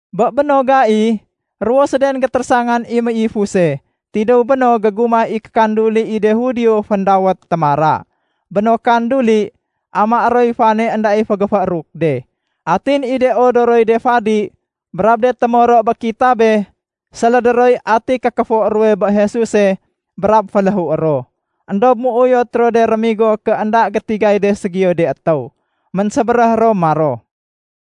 Bé béno gai, ruwo séden gétérésangan i méifuse tidéw béno gégumah i kékanduli i de Judio féndawét “Témara”. Bé no kanduli, amaé roy fane énda i fénggéfééruk de. Atin i de odoroy de fadi brab de témoro bé kitabe sélédé roy ati kékéfo ruwe bé Jesuse brab féléhué ro. Endob méuyot ro de rémigo ké énda gétigay de ségiyo de étéw. Ménsébéréh ro maro,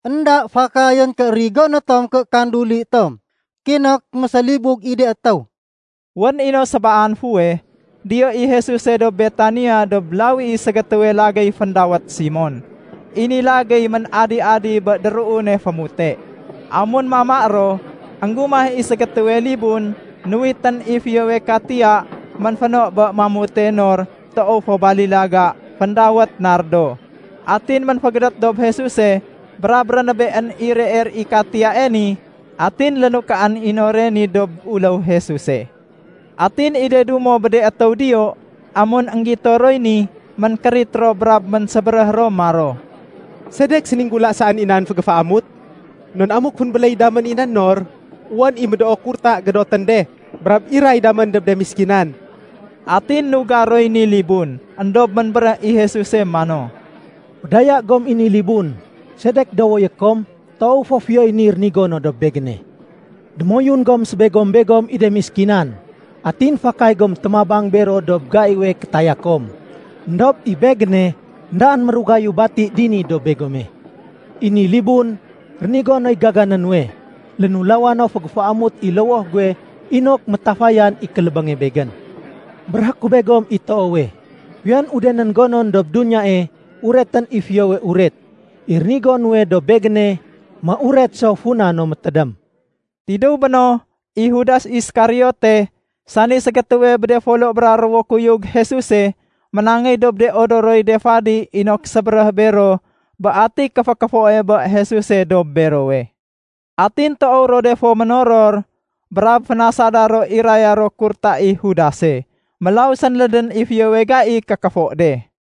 “Enda fakayén ké rigoné tom ké kanduli tom, kinok mésélibug i de étéw.” Wén i no sébaan fuweh, diyo i Jesuse dob Betania dob lawi i ségétéwe lagéy féndawét Simon. I ni lagéy ménadi-adi bé déruune fémute. Amun mama ro, énggumah i ségétéwe libun nuwitén i fiyowe katiya ménféno bé mamute nor toow fo balilaga féndawét nardo. Atin ménfégédét dob Jesuse brab rénébeén i reer i katiyae ni atin lénukaén i nore ni dob uléw Jesuse. Atin i de dumo bé de étéw diyo, amun énggito roy ni, ménkérit ro brab ménsébéréh ro maro, “Sedek séninggula saén i nan fégéféamut? Non amuk fénbéléy damén i nan nor, wén i médoo kurta gédotén de brab iray damén dob de méskinan.” Atin nugar roy ni libun. Endob ménbéréh i Jesuse mano, “Fédaya gom i ni libun. Sedek dowoyé kom? Toow fo fiyoy ni rénigo no dob Begéne. Démoyun gom gésébegom i de méskinan, atin fakay gom témabang bero dob gaiwe kétaya kom. Endob i Begéne, éndaén mérugayu bati dini dob begome. I ni libun, rénigo noy gagané nuwe. Lénulawa no fégéféamut i lowoh guwe inok métafayan i kélébénge Begén. Béréhé ku begom i toowe, fiyon udenén gonon dob duniyae uretén i Fiyowe Uret, i rénigo nuwe dob Begéne méuret so funa no métédém.” Tidéw béno, i Judas Iskariote, sani ségétéwe bé de folo bra ruwo kuyug Jesuse, ménangéy dob de odoroy de fadi inok sébéréh bero bé ati kéfékéfoe bé Jesuse dob berowe. Atin toow ro de fo ménoror, brab fénasada ro iraya ro kurta i Judase. Mélaw sénlédén i fiyowe gai kékéfo de.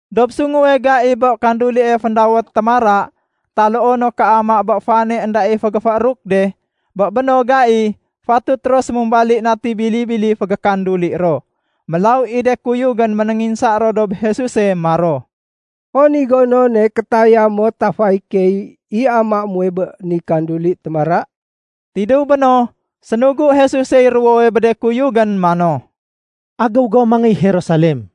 Dob sunguwe gai bé kandulie féndawét “Témara” taloo no “Kéama bé Fane Enda i Fénggéfééruk de”, bé béno gai fatut ro sémumbali nati bili-bili fégékanduli ro. Mélaw i de kuyugén ménénginsa ro dob Jesuse maro, “Hon i gonone kétaya mo tafayé key i amaé muwe bé ni kanduli ‘Témara’?” Tidéw béno, sénugu Jesusey ruwowe bé de kuyugén mano, “Agéw gom mangéy Jerusalem.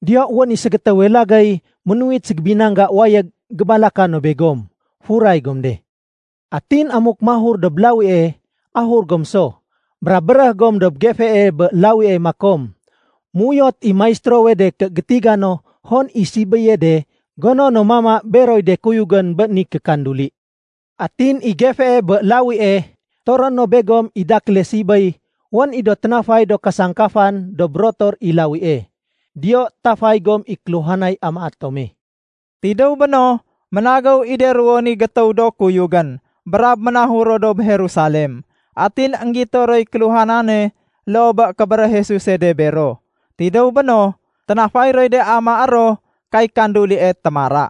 Diyo wén i ségétéwe lagéy ménuwit ségébinangga wayég gébalaka no begom. Furay gom de. Atin amuk mahur dob lawie, ahur gom so. Brab béréh gom dob gefee bé lawie makom, ‘Méuyot i Maistérowe de ké gétiga no hon i sibéye de gono no mama beroy de kuyugén bé ni kékanduli.’ Atin i gefee bé lawie toroé no begom i dakéle sibéy wén i do ténafay do kasangkafan dob rotor i lawie. Diyo tafay gom i kéluhanay amaé tome.” Tidéw béno, ménagéw i de ruwo ni gétéw do kuyugén brab ménahur ro dob Jerusalem. Atin énggito roy kéluhanane loo bé kébéréh Jesuse de bero. Tidéw béno, ténafay roy de amaé ro kay kandulie “Témara”.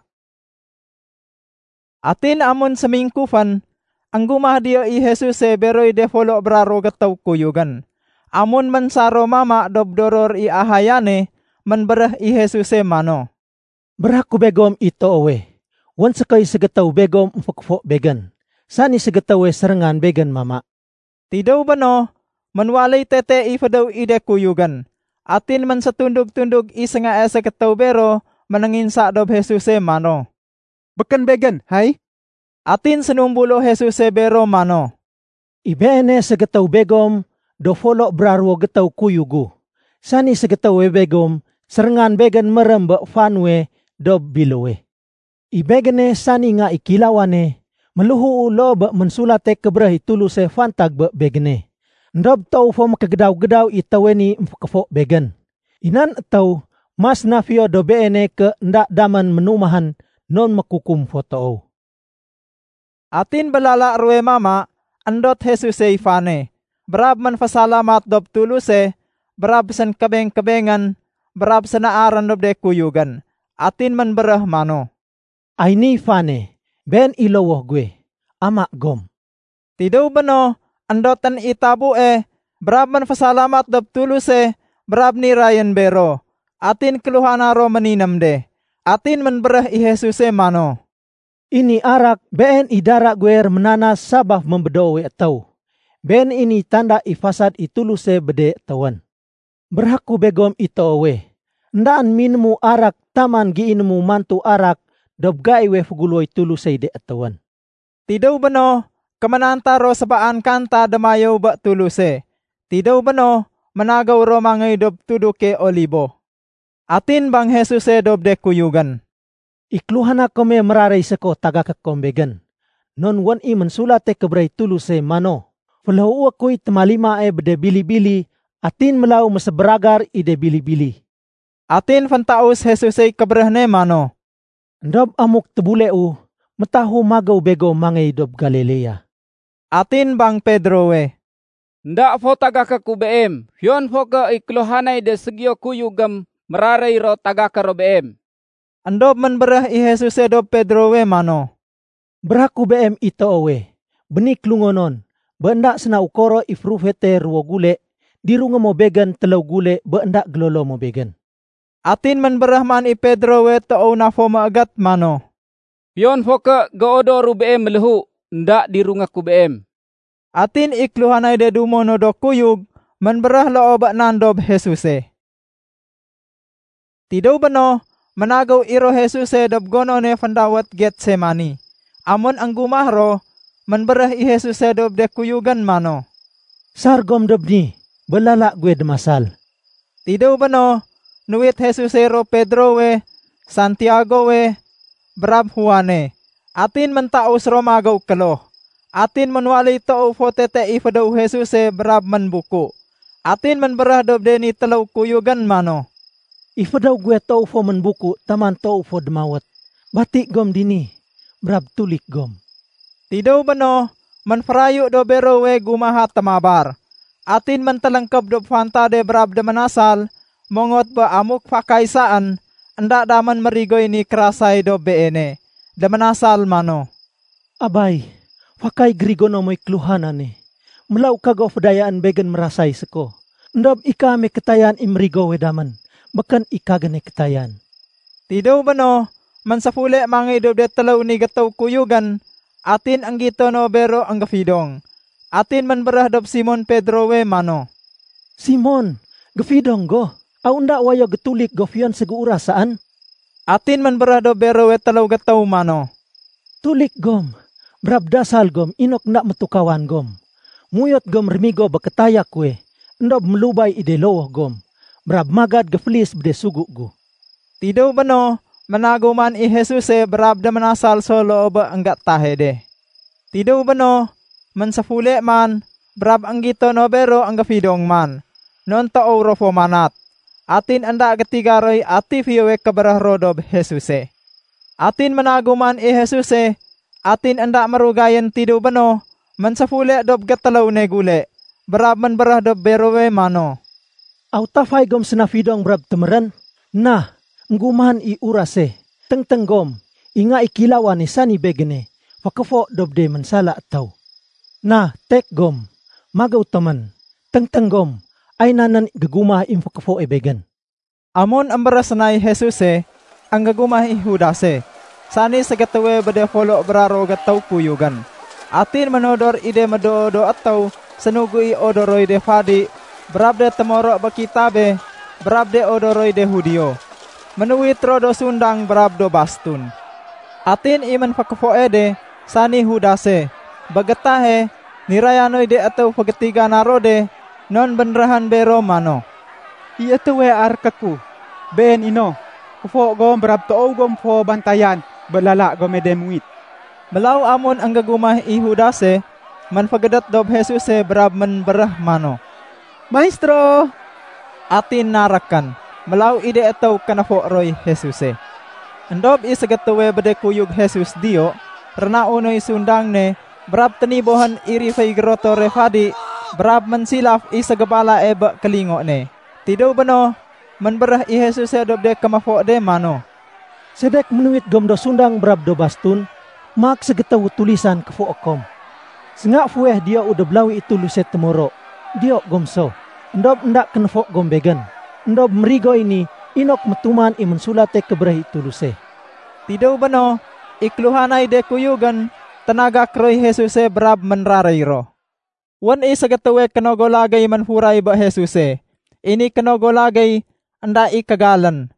Atin amun sémingkufén, énggumah diyo i Jesuse beroy de folo bra ruwo gétéw kuyugén. Amun ménsar ro mama dob doror i ahayane, ménbéréh i Jesuse mano, “Béréhé ku begom i toowe, wén sékoy ségétéw begom émfékéfo Begén, sani ségétéwe séréngan Begén mama.” Tidéw béno, ménwaléy tete i fédéw i de kuyugén. Atin ménsétundug-tundug i séngae ségétéw bero ménénginsa dob Jesuse mano, “Békén begén, hay?” Atin sénumbulo Jesuse bero mano, “I beene ségétéw begom do folo bra ruwo gétéw kuyug gu, sani ségétéwe begom séréngan Begén mérém bé fa nuwe dob biléwe. I Begéne, sani Nga i Kéilawane, méléhuu loo bé Ménsulate Kébéréh i Tuluse fantag bé Begéne. Endob toow fo mékégédaw-gédaw i étéwe ni émfékéfo Begén. I nan étéw, mas na fiyo dob beene ké énda damén ménumahén, non mékukum fo toow.” Atin bé lala ruwe mama, éndot Jesusey fane, brab ménfésalamat dob Tuluse, brab sénkébeng-kébengén, brab sénaarén dob de kuyugén. Atin ménbéréh mano, “Ay niy fane. Been i lowoh guwe. Ama gom.” Tidéw béno, éndotén i tabue, brab ménfésalamat dob Tuluse, brab nirayén bero. Atin kéluhana ro méniném de. Atin ménbéréh i Jesuse mano, “I ni arak, been i dara guwe réménanas sabaf bé médoowe étéw. Been i niy tanda i fasad i Tuluse bé de étéwén. Béréhé ku begom i toowe, éndaén minému arak taman géinému mantu arak dob gaiwe féguléwoy Tulusey de étéwén.” Tidéw béno, kéménanta ro sébaan kanta démayéw bé Tuluse. Tidéw béno, ménagéw ro mangéy dob tuduke Olibo. Atin bang Jesuse dob de kuyugén, “I kéluhana kome méraréy séko tagaké kom Begén. Non wén i Ménsulate Kébéréh i Tuluse mano, ‘Féléhué kuy témalimae bé de bili-bili, atin mélaw mésébéragar i de bili-bili.’” Atin féntaus Jesusey kébéréh ne mano, “Endob amuk tébuleu, métahu magéw begom mangéy dob Galilea.” Atin bang Pedrowe, “Enda fo tagaké ku Beem, fiyon fo ké i kéluhanay de ségiyo kuyugém méraréy ro tagaké ro Beem.” Endob ménbéréh i Jesuse dob Pedrowe mano, “Béréhé ku beem i toowe, bé ni kélungonon, bé énda séna ukoro i férufete ruwo gule, dirungé mo Begén téléw gule bé énda gélolo mo Begén.” Atin ménbéréh man i Pedrowe toow na fo méégét mano, “Fiyon fo ké géodoru Beem méléhu, énda dirungé ku Beem.” Atin i kéluhanay de dumo no do kuyug ménbéréh loo bé nan dob Jesuse. Tidéw béno, ménagéw i ro Jesuse dob gonone féndawét Getsemani. Amun énggumah ro, ménbéréh i Jesuse dob de kuyugén mano, “Sar gom dob ni bé lala guwe démasal.” Tidéw béno, nuwit Jesusey ro Pedrowe, Santiagowe, brab Juane, atin méntaus ro magéw kloh. Atin ménwaléy toow fo tete i fédéw Jesuse brab ménbuku. Atin ménbéréh dob de ni téléw kuyugén mano, “I fédéw guwe toow fo ménbuku taman toow fo démawét. Bati gom dini, brab tulik gom.” Tidéw béno, ménférayu dob berowe gumaha témabar. Atin méntéléngkéb dob fantade brab déménasal mongot bé amuk fakay saén, énda damén mérigoy ni kérasay dob Beene. Déménasal mano, “Abay, fakay gérigono moy kéluhanane. Mélaw kago fédayaén Begén mérasay séko. Endob i kaame kétayan i mérigowe damén, békén i kagéne kétayan.” Tidéw béno, ménséfule mangéy dob de téléw ni gétéw kuyugén, atin énggito no bero énggéfidong. Atin ménbéréh dob Simon Pedrowe mano, “Simon, géfidong go? Aw énda wayo gétulik go fiyon ségéuras saén?” Atin ménbéréh dob berowe téléw gétéw mano, “Tulik gom, brab dasal gom inok énda métukawan gom. Méuyot gom rémigo bé kétaya kuwe, éndob mélubay i de lowoh gom, brab magad géfélis bé de sugu gu.” Tidéw béno, ménagéw man i Jesuse, brab déménasal so loo bé énggétahe de. Tidéw béno, ménséfule man, brab énggito no bero énggéfidong man, non toow ro fo manat. Atin énda gétiga roy ati fiyowe kébéréh ro dob Jesuse. Atin ménagéw man i Jesuse atin énda mérugayén tidéw béno, ménséfule dob gétéléw ne gule, brab ménbéréh dob berowe mano, “Aw tafay gom séna fidong brab témérén? Na, énggumahén i urase. Téngténg gom, i Nga i Kéilawane, sani Begéne fékéfo dob de ménsala étéw. Na tek gom, magéw tomén. Téngténg gom, ay nan nén gégumah i émfékéfoe Begén.” Amun émbéréh sénay Jesuse, énggégumah i Judase, sani ségétéwe bé de folo bra ruwo gétéw kuyugén. Atin ménodor i de médoo do étéw sénugu i de odoroy de fadi brab de témoro bé kitabe brab de odoroy de Judio. Ménuwit ro do sundang brab do bastun. Atin i ménfékéfoe de, sani Judase, bé gétahe niraya noy de étéw fégétigana ro de non bénréhén bero mano, “I étéwe aréké ku, been i no. Kéfo gom brab toow gom fo bantayan bé lala gome de muwit.” Mélaw amun énggégumah i Judase, ménfégédét dob Jesuse brab ménbéréh mano, “Maistéro.” Atin narékén. Mélaw i de étéw kénéfo roy Jesuse. Endob i ségétéwe bé de kuyug Jesus diyo, rénau noy sundang ne brab ténibohén i riféy gérotore fadi brab ménsilaf i ségébalae bé kélingo ne. Tidéw béno, ménbéréh i Jesuse dob de kéméfo de mano, “Sedek ménuwit gom do sundang brab do bastun, maak ségétéwu tulisan kéfoé kom? Sénga fuweh diyou dob lawi i Tuluse témoro. Diyo gom so, éndob énda kénéfo gom Begén. Endob mérigoy ni inok métuman i Ménsulate Kébéréh i Tuluse.” Tidéw béno, i kéluhanay de kuyugén ténagak roy Jesuse brab ménraréy ro. Wén i ségétéwe kénogo lagéy ménfuray bé Jesuse. I ni kénogo lagéy énda i kégalén,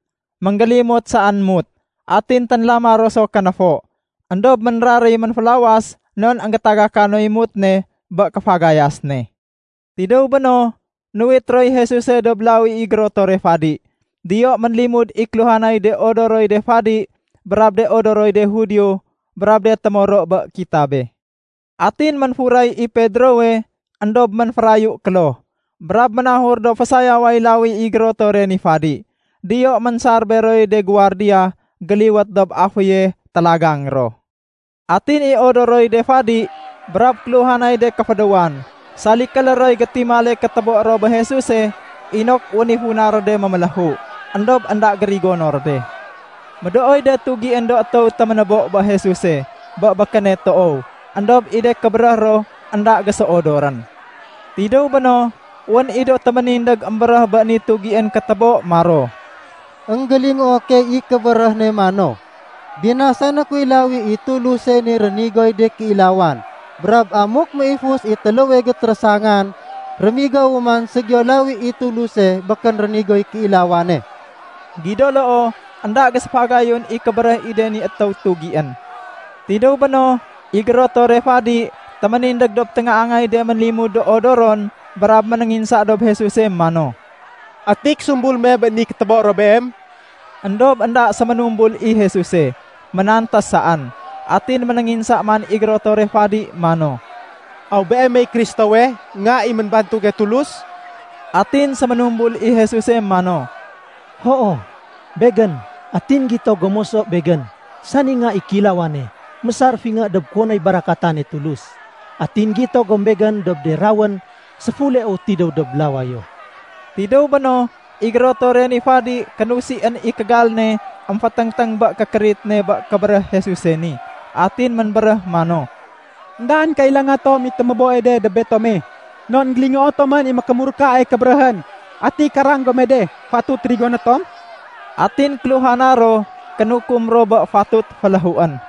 ménggélimot saén mut. Atin ténlama ro so kénéfo. Endob ménraréy ménfélawas non énggétagaka noy mut ne bé kéfagayas ne. Tidéw béno, nuwit roy Jesuse dob lawi i gérotore fadi. Diyo ménlimud i kéluhanay de odoroy de fadi brab de odoroy de Judio brab de témoro bé kitabe. Atin ménfuray i Pedrowe éndob ménférayu kloh. Brab ménahur dob fésayaway lawi i gérotore ni fadi. Diyo ménsar beroy de guwardiya géliwét dob aféye télagang ro. Atin i de odoroy de fadi brab kéluhanay de kéfédéwan, salkélé roy gétimale kétébo ro bé Jesuse inok wén i funa ro de méméléhu, éndob énda gérigono ro de. Médooy de tugién do étéw téménébo bé Jesuse bé békéne toow, éndob i de kébéréh ro énda géséodorén. Tidéw béno, wén i do téménindég émbéréh bé ni tugién kétébo maro, “Enggélingoo key i kébéréh ne mano, ‘Binasané kuy lawi i Tuluse ni rénigoy de kéilawan, brab amuk méifus i téléwe gétérésangan, rémigowu man ségiyo lawi i Tuluse békén rénigoy kéilawane.’” Gido loo, énda géséfagayun i kébéréh i de ni étéw tugién. Tidéw béno, i gérotore fadi téménindég dob téngaangay de ménlimud do odoron brab ménénginsa dob Jesuse mano, “Ati késumbul me bé ni kétébo ro Beem?” Endob énda séménumbul i Jesuse, ménantés saén. Atin ménénginsa man i gérotore fadi mano, “Aw Beemey Kristowe, Nga i ménbantuge Tulus?” Atin séménumbul i Jesuse mano, “Hoo, Begén. Atin gito gom moso Begén, sani Nga i Kéilawane, mésar fingé dob kuwonoy barakatane Tulus. Atin gito gom Begén dob de rawén séfuleu tidéw dob lawayo.” Tidéw béno, i gérotore ni fadi kénusién i kégal ne émféténgténg bé kékérit ne bé kébéréh Jesuse ni. Atin ménbéréh mano, “Endaén kailanga tom i téméboe de dob betome. Non énggélingoo tomén i mékémurkae kébéréhén. Ati karang gome de fatut rigoné tom?” Atin kéluhana ro kénukum ro bé fatut féléhuén.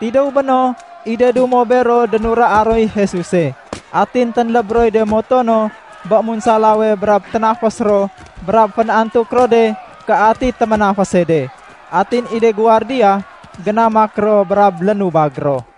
Tidéw béno, i de dumo bero dénuraa roy Jesuse. Atin ténléb roy de moto no bé munsalawe brab ténafés ro brab fén-antuk ro de ké ati téménafése de. Atin i de guwardiya, génamak ro brab lénubag ro.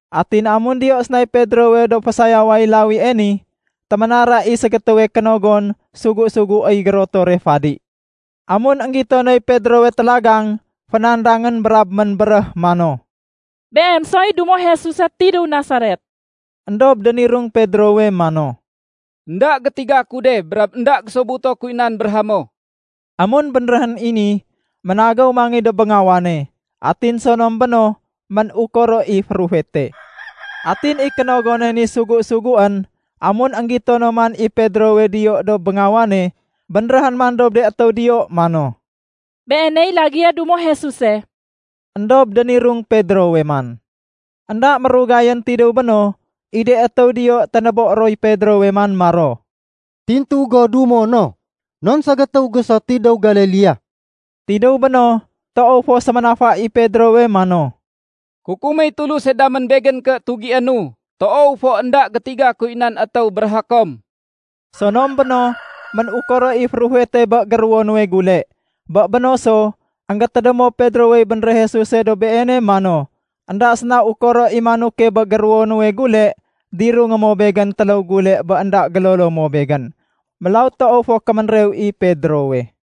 Atin amun diyo sénay Pedrowe dob fésayaway lawie ni, téménara i ségétéwe kénogon sugu-suguéy gérotore fadi. Amun énggito noy Pedrowe télagang, fénandangén brab ménbéréh mano, “Beem soy dumo Jesuse tidéw Nasaret.” Endob dénirung Pedrowe mano, “Enda gétiga ku de brab énda gésobuto kuy nan béréhé mo.” Amun bénréhén i ni, ménagéw mangéy dob béngawane. Atin sonom béno, ménukoro i férufete. Atin i kénogone ni sugu-suguén, amun énggito no man i Pedrowe diyo dob béngawane, bénréhén man dob de étéw diyo mano, “Beeney lagéye dumo Jesuse.” Endob dénirung Pedrowe man. Enda mérugayén tidéw béno, i de étéw diyo ténébo roy Pedrowe man maro, “Tintu go dumo no, non ségétéw go so tidéw Galilea.” Tidéw béno, toow fo séménafa i Pedrowe mano, “Kukuméy Tuluse damén begén ké tugiénu. Toow fo énda gétiga kuy nan étéw béréhé kom.” Sonom béno, ménukoro i férufete bé géruwo nuwe gule. Bé béno so, énggétédémo Pedrowey bénréh Jesuse dob beene mano, “Enda séna ukoro i manoke bé géruwo nuwe gule, dirungé mo Begén téléw gule bé énda gélolo mo Begén.” Mélaw toow fo kéménrew i Pedrowe.